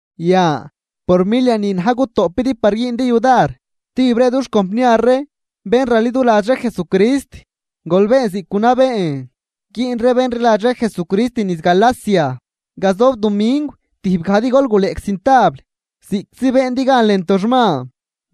Yan por milia ni na̱j gutoꞌpidi par güündi yudar stijb ree dux compniar ree bén raliduladx ree Jesucrist, gol been ziꞌc gunabeen güün ree bén rliladx ree Jesucrist niz Galacia. Gazob dumingw tijb gajdi gol guleꞌc cintabl ziꞌctzi beendi gan lën toxman,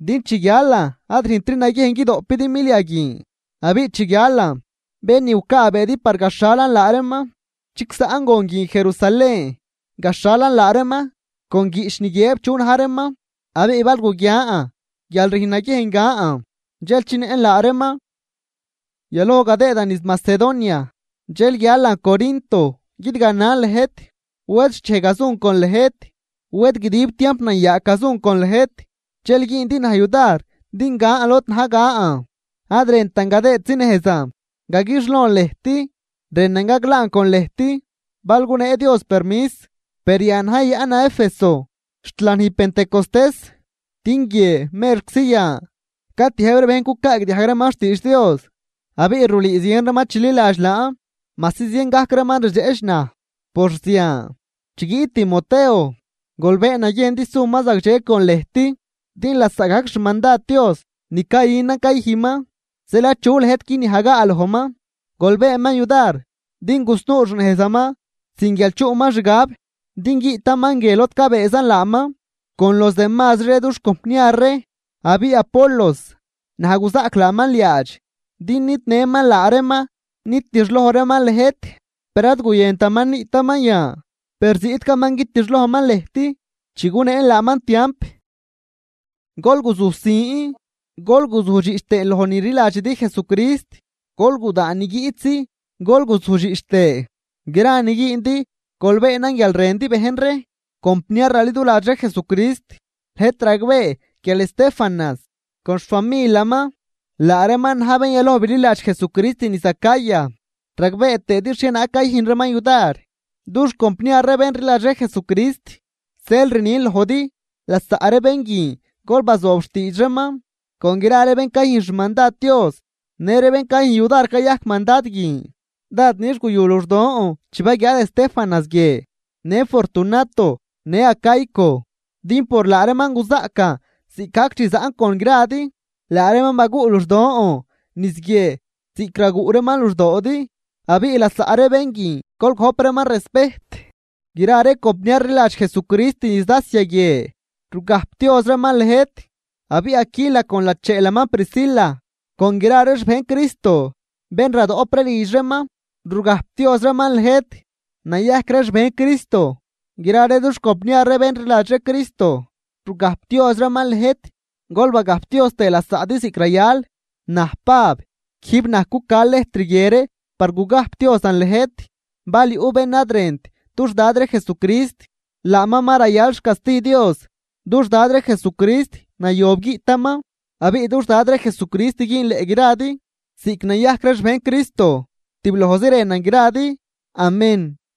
din chi guialan ad rüjntri naguiejn guidoꞌpidi milia guin. Abiꞌ chi guialan, bén ni gucaabeedi par gaxhalan laa reeman chigsaꞌn gon guin Jerusalén gaxhalan laa reeman con guiꞌch ni guiëb chu na̱j reeman. Abiꞌ bal guguian guial rüjn naguiejn gan dxel chinëꞌn laa reeman. Yaloj gadëëdan niz Macedonia dxel guialan Corinto guidganan lëjt. Wed xchej gazun con lëjt. Wed guidib tiamp nayaag gazun con lëjt, dxel güündi naj yudar din gan lod na̱j gan. Ad rëntan gadëëdzi nejzan gaguixlon lëjt, rënan gaglaan con lëjt bal gunee Dios permis. Per yan na̱j yayaꞌnan Éfeso xt lanij pentecostés, din guie merczi yan catiëjb ree bejn cucaagdiajg reeman xtiidx Dios, abiꞌ rulüü zien reeman chililadx laan, majsi zien gajc reeman rdxeꞌch naj por zian. Chi guiꞌt Timoteo, gol been naguiejn din suman zagdxe con lëjt, din lasaꞌgajc xmandad Dios ni cayünan cayüjnman. Zeel achu lëjt guiniajgaa lojman, gol beenman yudar din gusnuu xnejzaman sin guial chuꞌman xgab, din guiꞌtaman guie lod cabëëzan laaman con los demazri ree dux compniar ree. Abiꞌ Apolos, naj guzaꞌc laaman liaadx din nidnëman laa reeman nitixloj reeman lëjt, per ad guyëntaman niꞌtaman yan, per ziꞌtcaman guitixlojman lëjt chi guneen laaman tiamp. Gol guzujsin gol guzujdxiꞌch tëë loj ni rliladxidi Jesucrist. Gol gudaan ni guiꞌtzi gol guzujdxiꞌch tëë. Gra ni güündi gol beenan guial rëndi bejn ree. Compniar raliduladx ree Jesucrist, lëjt ragbee guial Estéfanas con xfamilaman laa reeman na̱j bén yaloj bililadx Jesucrist niz Acaya, ragbee tëëdi xhienaag cayüjn reeman yudar dux compniar ree bén rliladx ree Jesucrist. Zeel rnin lojdi: Lasaꞌ ree bén guin gol bazoob xtiidx reeman con gra ree bén cayüjn xmandad Dios në ree bén cayüjn yudar cayajc mandad guin. Dád nix guyu luxdon chi baguiaad Estéfanas guie, në Fortunato në Acaico. Din por laa reeman guzaꞌcan ziꞌcgajc chi zaꞌn con gradi. Laa reeman baguꞌ luxdon niz guie ziꞌc raguꞌ reeman luxdoodi, abiꞌ lasaꞌ ree bén guin gol gojp reeman respejt. Gra ree compniar rliladx Jesucrist niz Asia guie rugajpdioz reeman lëjt. Abiꞌ Aquila con lacheelaman Priscila con gra ree xbejn Cristo bén radoꞌp ree lidx reeman, rugajpdioz reeman lëjt, nayajc ree xbejn Cristo. Gra ree dux compniar ree bén rliladx ree Cristo rugajpdioz reeman lëjt, gol bagajpdioz tëë lasaꞌdi ziꞌc rayal. Naj Pab, quijb naj cuca lëjtr guie ree par gugajpdiozan lëjt. Bal yuꞌ bén ad rënt dux Dad ree Jesucrist, laaman ma rayal xcasti Dios. ¡Dux Dad ree Jesucrist nayob guiꞌtaman! Abiꞌ dux Dad ree Jesucrist güünleꞌ gradi. Ziꞌc nayajc ree xbejn Cristo tiblojzi rënan gradi. Amén.